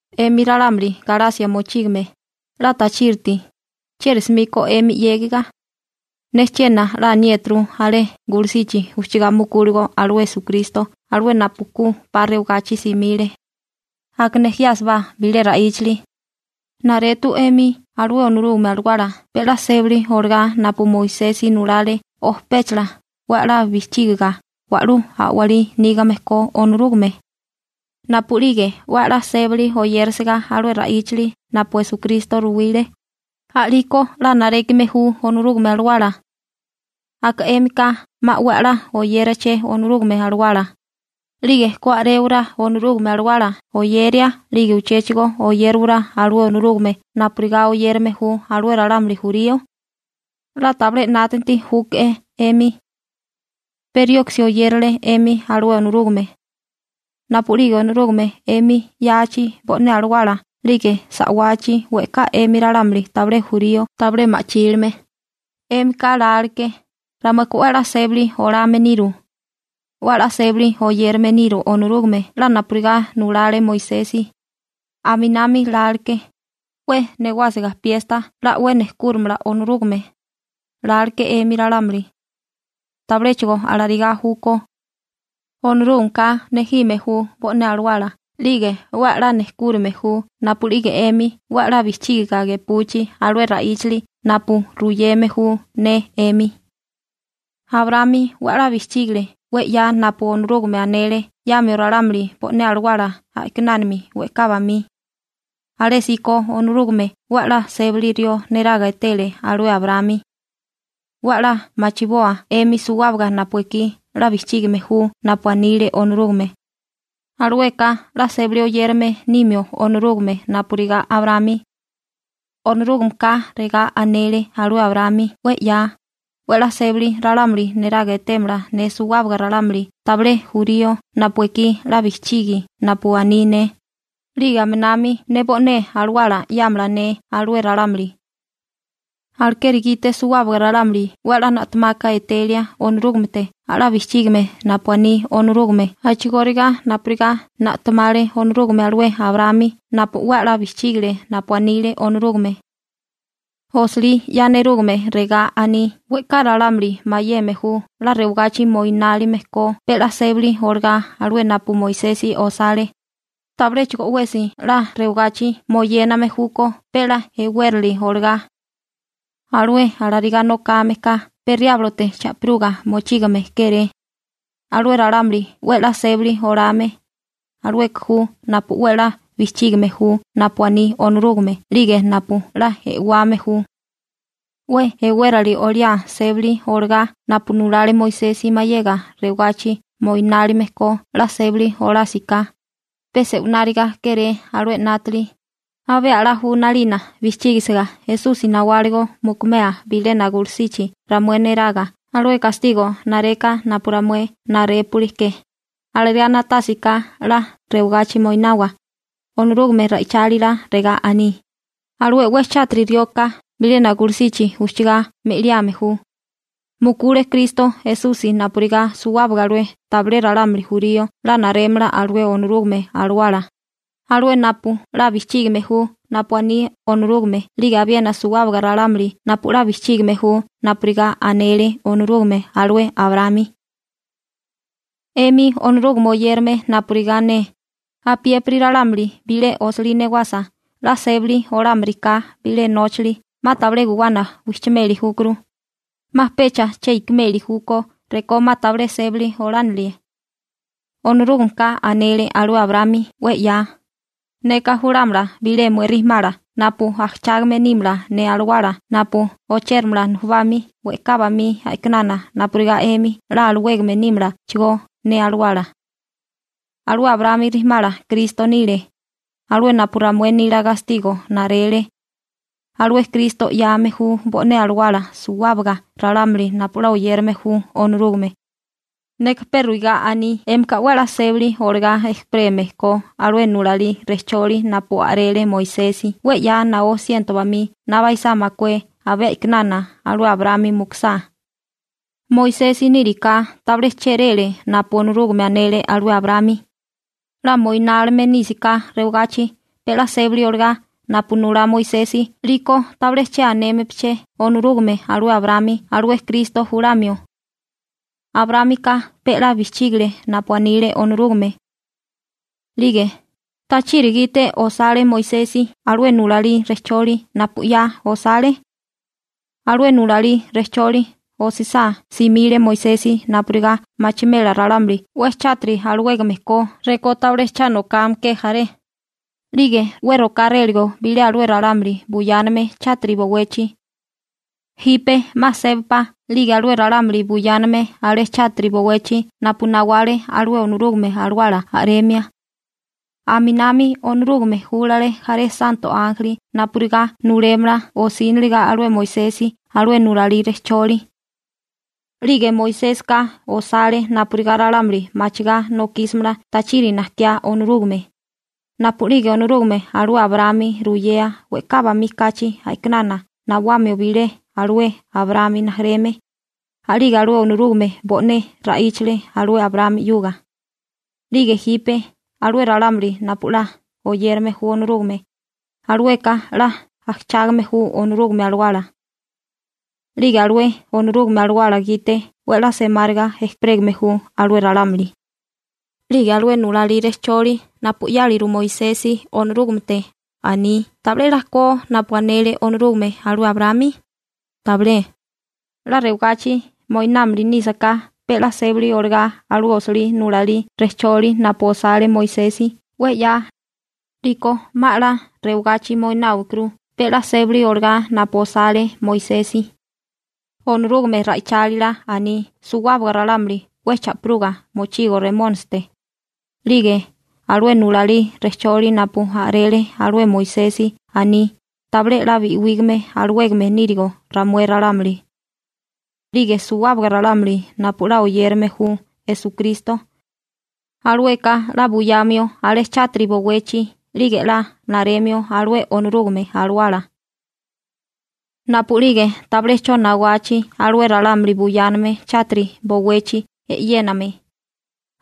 'Emi ralámuli Galasia mochígame, 'la tachíriti. ¿Chieri 'smíkó 'emi 'yégiga? Ne chiena 'la aniéturu alé gulusichi ujchagá mukúligo alué Esukristo alué napu ku 'pa rewagachi simile. Aka nejiásibá bilé ra'íchali. ¿Naretu 'emi alué Onorúgame Alawala pe 'la sébali olagá napu Moisesi nulale o péchala 'we 'la bijchígiga wa'lú a'walí nígame ko Onorúgame? Napu'lige 'we 'la sébali oyérisiga alué ra'íchili napu Esukristo ruwile, a'liko 'la narékime ju Onorúgame Alawala. Aka 'émika 'ma 'we 'la oyéraché Onorúgame Alawala, ¿'lige ku a'réwarábá Onorúgame Alawala oyeria 'lige uchéchigo oyériwará alué Onorúgame pe napurigá oyérame ju alué ralámuli jurío? 'La tabilé 'nátanti júke'é 'emi. ¿Pe rioksi oyérale 'emi alué Onorúgame? Napu'lige Onorúgame 'emi 'yachi bo'né alawala 'lige sa'wachi we'ká 'emi ralámuli tabilé jurío tabilé ma'chílime, 'émika láleké: «Ramueka 'we 'la sébali olame niru. 'We 'la sébali oyérame niru Onorúgame 'la napurigá nulale Moisesi.» Aminami láleké: «'We newásiga piesta 'la 'we nejkúrimala Onorúgame», láleké 'emi ralámuli. Tabiléchigo alarigá júkó. Onorúgameka nejime ju bo'né alawala 'lige 'we 'la nejkúrime ju napu'lige 'emi 'we 'la bijchígiga gepuchi alué ra'íchali napu ruyeme ju ne 'emi. Abraámi 'we 'la bijchígale 'we 'ya napu Onorúgame anele 'yamio ralámuli bo'né alawala a'kinánami we'ká bamí. Alésíko Onorúgame 'we 'la sébali rió neraga etele alué Abraámi. 'We 'la machiboa 'emi suwábaga napu ekí 'la bijchígime ju napu anile Onorúgame, alueka 'la sébali oyérame nimio Onorúgame napurigá Abraámi. Onorúgameka regá anele alué Abraámi 'we 'ya: «'We 'la sébali ralámuli neraga etémala ne suwábaga ralámuli tabilé jurío napu ekí 'la bijchigi napu aní ne, 'lige aminami ne bo'né alawala 'yámala ne alué ralámuli.» Alekeri gite suwábaga ralámuli 'we 'la na'temaka etelia Onorúgamete a'lá bijchígime napu aní Onorúgame a'chigóriga napurigá na'temale Onorúgame alué Abraámi napu 'we 'la bijchígile napu anile Onorúgame. Osilí 'ya nerúgame regá aní: «We'ká ralámuli mayeme ju 'la rewagachi moinálime ko pe 'la sébali olagá alué napu Moisesi osale, tabiléchigo 'wesi 'la rewagachi moyéname júkó pe 'la e'wérali olagá. Alué alarigá nokame ka pe Riáblote cha'piruga mochígame kéré.» Alué ralámuli 'we 'la sébali olame, alueka ju napu 'we 'la bijchígime ju napu aní Onorúgame 'lige napu 'la e'wame ju. 'We e'wérali oliá sébali olagá napu nulale Moisesi mayega rewagachi moináliame ko 'la sébali olásiká, pe se'wináriga kéré alué 'nátili, abé 'la ju 'nalina bijchígisiga Esusi nawáligo mukumea bilena gulusichi ramué neraga alué gastigo nareka napu ramué narépuli ke, alarigá na'tásiká 'la rewagachi moinawa. Onorúgame ra'ichálila regá aní: «Alué 'we chátiri rioka bilena gulusichi ujchugá me'liame ju.» Mukule Kristo Esusi napurigá suwábaga alué tabilé ralámuli jurío 'la narémala alué Onorúgame Alawala, alué napu 'la bijchígame ju napu aní Onorúgame 'lige abiena suwábaga ralámuli napu 'la bijchígime ju napurigá anele Onorúgame alué Abraámi. 'Emi Onorúgame oyérame napurigá ne, apiépiri ralámuli bilé osilí newasa 'la sébali olámiriká bilé nóchali 'ma tabilé guwana wijchimeli júkuru, 'ma pecha che ikimeli júkó rekó 'ma tabilé sébali olánilie. Onorúgameka anele alué Abraámi 'we 'ya: «Neka julámala bilé mué rijimala napu ajchágame nímala ne Alawala napu ochéramala nujubami we'ká bamí a'kinana napurigá 'emi 'la alawégame nímalachigó ne Alawala.» Alué Abraámi rijimala Kristo nile, alué napu ramué nila gastigo narele. Alué Kristo 'yame ju bo'né alawala suwábaga ralámuli napu 'la oyérame ju Onorúgame. Neka pe ruigá aní 'émika 'we 'la sébali olagá ejperégame ko alué nulalí rejcholi napu a'rele Moisesi 'we 'ya naó siento bamí na baisá makué abé a'kinana alué Abraámi mukusá. Moisesi níriká tabilé chéréle napu Onorúgame anele alué Abraámi. 'La moinálime nísaká rewagachi pe 'la sébali olagá napu nulá Moisesi 'liko tabilé che anémepeché Onorúgame alué Abraámi alué Kristo julamio. Abraámika pe 'la bijchígile napu anile Onorúgame. 'Lige ¿tachiri gite osale Moisesi alué nulalí rejcholi napu 'ya osale? Alué nulalí rejcholi osisá simile Moisesi napurigá machimela ralámuli 'we chátiri alawégame ko rekó tabilé cha nokame ke jaré, 'lige 'we rokáréligo bilé alué ralámuli buyáname chátiri bowechi. Jipe 'ma sébapá 'lige alué ralámuli buyáname alé chátiri bowechi napu nawale alué Onorúgame Alawala a'remia. Aminami Onorúgame júlale jaré santo ánjeli napurigá nulémala osíniliga alué Moisesi alué nulalí rejcholi. 'Lige Moisésika osale napurigá ralámuli machigá nokísimala tachiri najkiá Onorúgame. Napu'lige Onorúgame alué Abraámi ruyea we'ká bamí kachi a'kinana nawamio bilé alué Abraámi rijimala, a'lige alué Onorúgame bo'né ra'íchale alué Abraámi 'yuga. 'Lige jipe, alué ralámuli napu 'la oyérame ju Onorúgame, alueka 'la ajchágame ju Onorúgame Alawala. 'Lige alué Onorúgame Alawala gite 'we 'la semáriga ejperégame ju alué ralámuli. 'Lige alué nulalí rejcholi napu 'yáliru Moisesi Onorúgamete aní, ¿tabilé 'la ko napu anele Onorúgame alué Abraámi? Tabilé. 'La rewagachi moináliame nísaká pe 'la sébali olagá alué osilí nulalí rejcholi napu osale Moisesi 'we 'ya, 'liko 'ma 'la rewagachi moináwikuru pe 'la sébali olagá napu osale Moisesi. Onorúgame ra'ichálila aní suwábaga ralámuli 'we cha'piruga mochigo Remónisite, 'lige alué nulalí rejcholi napu a'rele alué Moisesi aní tabilé 'la bi'wígame alawégame nírigo ramué ralámuli. 'Lige suwábaga ralámuli napu 'la oyérame ju Esukristo, alueka 'la buyamio alé chátiri bowechi 'lige 'la naremio alué Onorúgame Alawala. Napu'lige tabilé 'cho nawachi alué ralámuli buyáname chátiri bowechi e'yéname,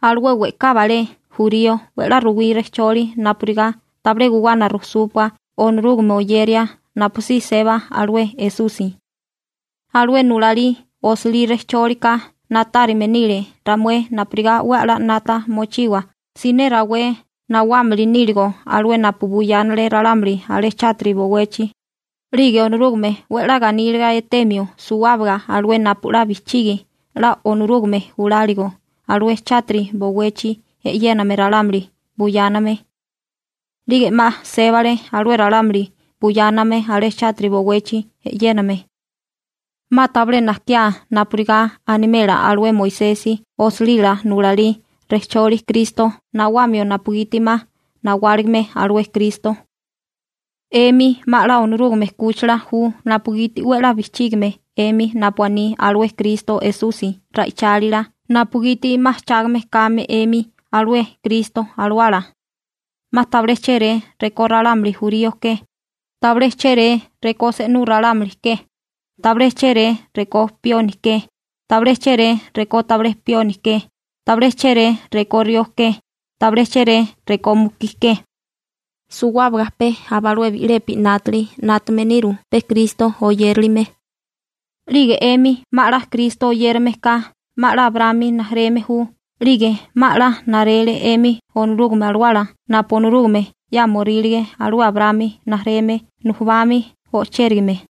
alué we'ká balé jurío 'we 'la ruwí rejcholi napurigá tabilé guwana rujsúpua Onorúgame oyeria napusí seba alué Esusi. Alué nulalí osilí rejchólika na'tárime nile ramué napurigá 'we a'lá 'nata mochiwa siné rawé nawámili níligo alué napu buyánale ralámuli alé chátiri bowechi, 'lige Onorúgame 'we 'la ganíliga etemio suwábaga alué napu 'la bijchigi 'la Onorúgame júlaligo alué chátiri bowechi e'yéname ralámuli buyáname. 'Lige 'ma sébale alué ralámuli buyáname alé chátiri bowechi e'yéname. 'Ma tabilé najkiá napurigá animela alué Moisesi osilila nulalí rejcholi Kristo nawamio napugiti 'ma nawáligime alué Kristo. 'Emi 'ma 'la Onorúgame 'kúchila ju napugiti 'we 'la bijchígime 'emi napu aní alué Kristo Esusi ra'ichálila napugiti 'ma ajchágame kame 'emi alué Kristo Alawala. 'Ma tabilé chéré rekó ralámuli jurío ke, tabilé chéré rekó se'nú ralámuli ke, tabilé chéré rekó pioni ke, tabilé chéré rekó tabilé pioni ke, tabilé chéré rekó rió ke, tabilé chéré rekó mukí ke. Suwábaga pe aba alué bi'lepi 'nátili 'nátame niru pe Kristo oyérilime. 'Lige 'emi 'ma 'la Kristo oyérame ka 'ma 'la Abraámi rijimala ju 'lige 'ma 'la narele 'emi Onorúgame Alawala napu Onorúgame 'yámorílige alué Abraámi rijimala nujubami o'chérigame.